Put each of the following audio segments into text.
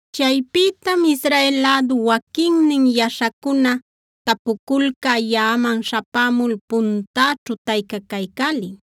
Chaypïtam Israel lädu waquinnin yaśhacuna tapuculcä yaꞌaman śhapämul puntäćhu taycacaycälin.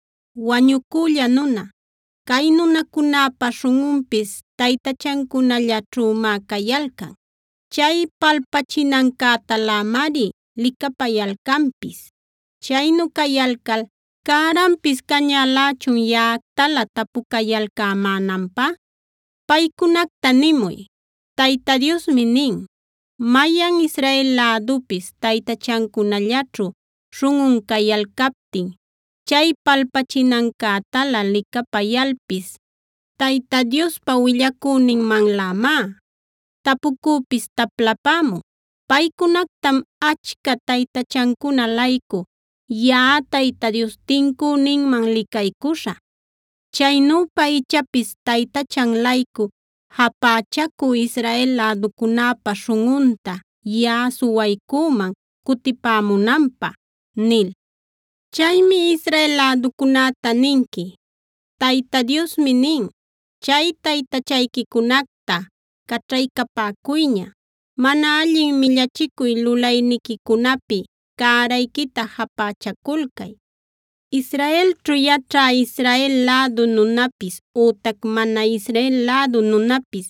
“Wañucülla nuna, cay nunacunäpa śhunꞌunpis taytachancunallaćhümá cayalcan. Chay palpachinancätalämari licapayalcanpis. Chaynu cayalcal ¿cäranpis cañälächun yaꞌactalä tapucayalcämänanpä? Paycunacta nimuy: Tayta Diosmi nin: ‘Mayan Israel lädupis taytachancunallaćhu śhunꞌun cayalcaptin, chay palpachinancätalä licapayalpis Tayta Diospa willacüninmanlämá tapucüpis taplapämun. Paycunactam achca taytachancuna-laycu yaꞌa Tayta Dios tincüninman licaycuśhä. Chaynüpa ichapis taytachan-laycu japächacü Israel läducunäpa śhunꞌunta yaꞌa suwaycüman cutipämunanpä’ nil. “Chaymi Israel läducunäta ninqui: ‘Tayta Diosmi nin: Chay taytachayquicunacta caćhaycapäcuyña; mana allin millachicuy lulayniquicunapi cärayquita japächaculcay. Israelćhu yaćhä Israel lädu nunapis ütac mana Israel lädu nunapis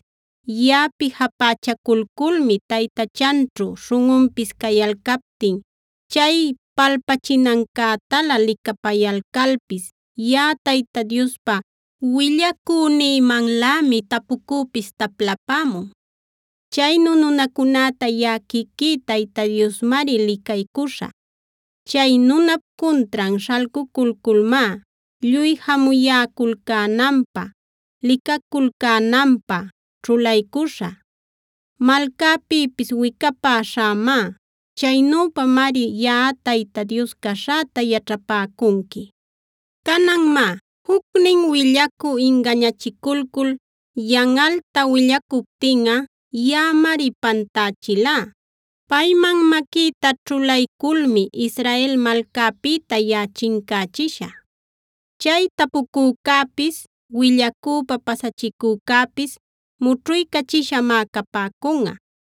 yaꞌapi japächaculculmi taytachanćhu śhunꞌunpis cayalcaptin, chay palpachinancätalä licapayalcalpis yaꞌa Tayta Diospa willacünïmanlämi tapucüpis taplapämun. Chaynu nunacunäta yaꞌa quiquí Tayta Diosmari licaycuśhä. Chay nunap cuntran śhalculculmá lluy jamuyäculcänanpä, licaculcänanpä ćhulaycüśhä. Malcäpïpis wicapäśhämá. Chaynüpamari yaꞌa Tayta Dios caśhäta yaćhapäcunqui. “ ‘Canan má, jucnin willacü ingañachiculcul yanꞌalta willacuptinꞌa yaꞌamari pantächilá. Payman maquïta ćhulayculmi Israel malcäpïta yaꞌa chincächishä. Chay tapucücäpis, willacüpä pasachicücäpis mućhuycachishamá capäcunꞌa.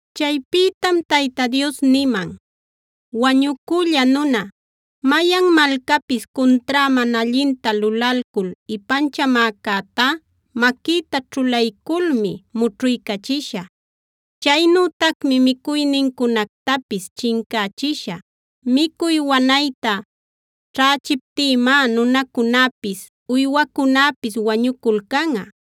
Chaypïtam Tayta Dios niman: “Wañucülla nuna, mayan malcapis cuntrá mana allinta lulalcul ipanchamäcätá maquïta ćhulayculmi mućhuycachishä. Chaynütacmi micuynincunactapis chincächishä; micuy wanayta ćhächiptïmá nunacunapis, uywancunapis wañuculcanꞌa.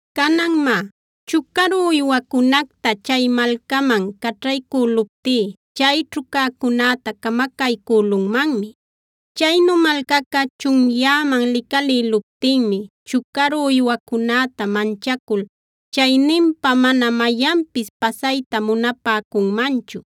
“Canan má, chucaru uywacunacta chay malcaman caćhaycüluptí chayćhu cäcunäta camacaycülunmanmi. Chaynu malcaca chunyäman licalïluptinmi chucaru uywacunäta manchacul chayninpa mana mayanpis pasayta munapäcunmanchu.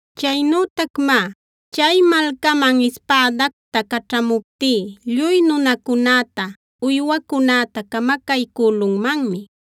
“Chaynütac má, chay malcaman ispädacta caćhamuptí lluy nunacunäta, uywacunäta camacaycülunmanmi.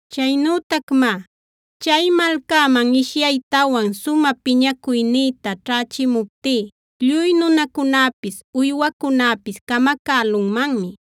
“Chaynütac má, chay malcaman ishyaytawan sumä piñacuynïta ćhächimuptí lluy nunacunapis uywacunapis camacälunmanmi.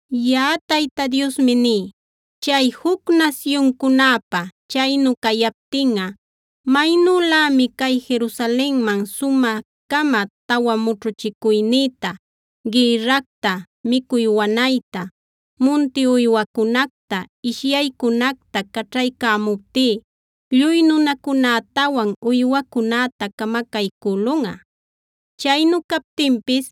“Yaꞌa Tayta Diosmi ní: Chay juc nasyuncunäpä chaynu cayaptinꞌa maynülämi cay Jerusalenman sumä-cama tawa mućhuchicuynïta: gïrracta, micuy wanayta, munti uywacunacta, ishyaycunactaa caćhaycämuptí lluy nunacunätawan uywacunäta camacaycülunꞌa. Chaynu captinpis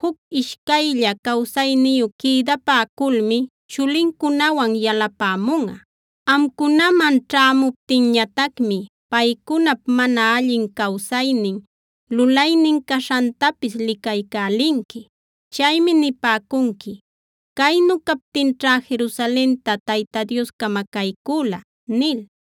juc ishcaylla cawsayniyu quïdapäculmi chulincunawan yalapämunꞌa. Amcunaman ćhämuptinñatacmi paycunap mana allin cawsaynin, lulaynin caśhantapis licaycälinqui. Chaymi nipäcunqui: ‘Caynu captinćhá Jerusalenta Tayta Dios camacaycüla’ nil.